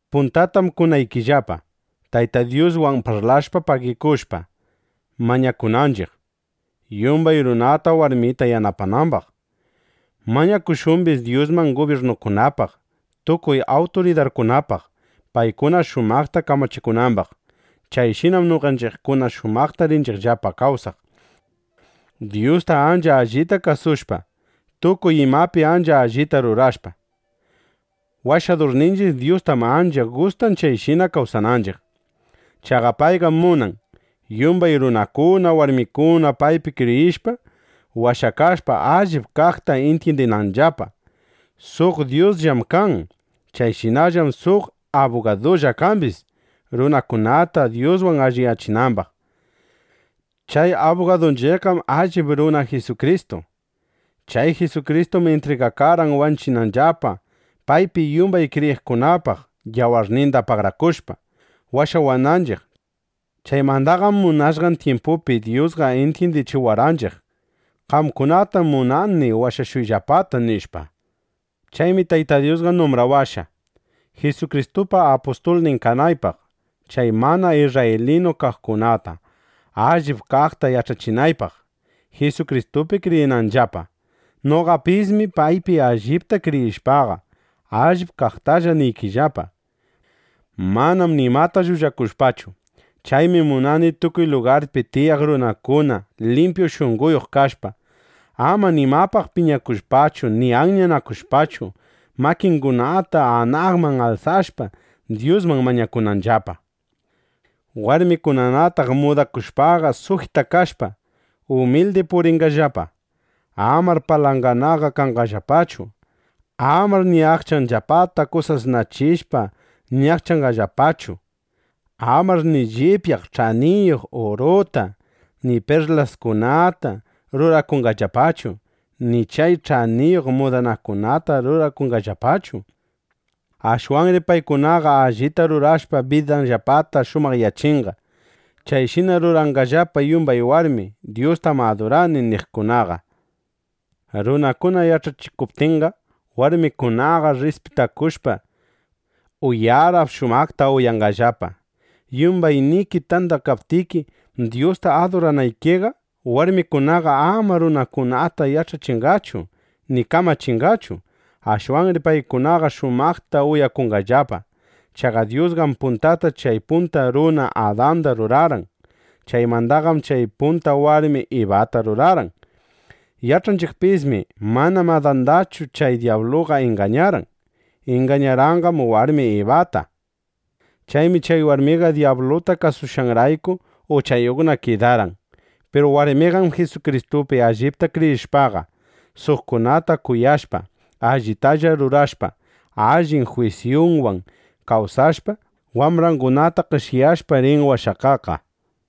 Puntatam kunaykillapa, Tayta Dyuswan parlashpa pagikushpa, mañakunanchiq, yumbay runata warmita yanapanambaq. Mañakushumbis Dyusman gubyirnukunapaq, tukuy awturidarkunapaq, paykuna shumaqta kamachikunambaq. Chayshinam noqanchiqkuna shumaqta rinchiqllapa kawsaq, Dyusta ancha allita kasushpa, tukuy imapi ancha allita rurashpa. Washadurninchiq Dyustam ancha gustan chayshina kawsananchiq. Chaqa payqam munan, yumbay runakuna, warmikuna paypi kriyishpa, washakashpa, allip kaqta intyindinanllapa. Suq Dyusllam kan. Chayshinallam suq abugadulla kambis, runakunata Dyuswan alliyachinambaq. Chay abugadunchiqqam allip runa Jisukristu. Chay Jisukristum intrigakarqan wanchinanllapa, paypi yumbay kriyiqkunapaq yawarninda pagarakushpa, washawananchiq. Chaymandaqam munashqan tyimpupi Dyusqa intyindichiwarqanchiq: Qamkunatam munani washashuyllapata, nishpa. Chaymi Tayta Dyusqa numbrawashqa, Jisukristupa apustulnin kanaypaq, chay mana isrraylinu kaqkunata allip kaqta yach'achinaypaq, Jisukristupi kriyinanllapa. Noqapismi paypi allipta kriyishpaqa, allip kaqtalla niykillapa, manam nimata llullakushpachu. Chaymi munani tukuy lugarpi tiyaq runakuna limpyu shunqoyuq kashpa, ama nimapaq piñakushpachu ni anyanakushpachu, makingunata anaqman alsashpa, Dyusman mañakunanllapa. Warmikunanataq mudakushpaqa, sujitakashpa, umildi purinqallapa. Amar palanganaqa kanqallapachu. Amar ni aqchanllapata kusasnachishpa ñaqchanqallapachu. Amar ni llipyaq ch'aniyuq uruta, ni perlaskunata rurakunqallapachu. Ni chay ch'aniyuq mudanakunata rurakunqallapachu. Ashwanri paykunaqa allita rurashpa, bidanllapata shumaqyachinqa. Chayshina ruranqallapa yumbay warmi “Dyustam adurani” niqkunaqa. Runakuna yach'achikuptinqa, warmikunaqa rrispitakushpa, uyarap (uyara) shumaqta uyanqallapa. Yumbayniki tandakaptiki Dyusta aduranaykiqa, warmikunaqa ama runakunata yach'achinqachu ni kamachinqachu. Ashwanri paykunaqa shumaqta uyakunqallapa. Chaqa Dyusqam puntata chay punta runa Adanda rurarqan. Chaymandaqam chay punta warmi Ibata rurarqan. Yach'anchiqpismi: Manam Adandachu chay dyabluqa ingañarqan. Ingañarqanqam warmin Ibata. Chaymi chay warmiqa dyabluta kasushqanrayku uchayuqna kidarqan. Piru warmiqam Jisukristupi allipta kriyishpaqa, suqkunata kuyashpa, allitalla rurashpa, allin jwisyunwan kawsashpa, wambrangunata qeshyashpa, rin washakaqqa.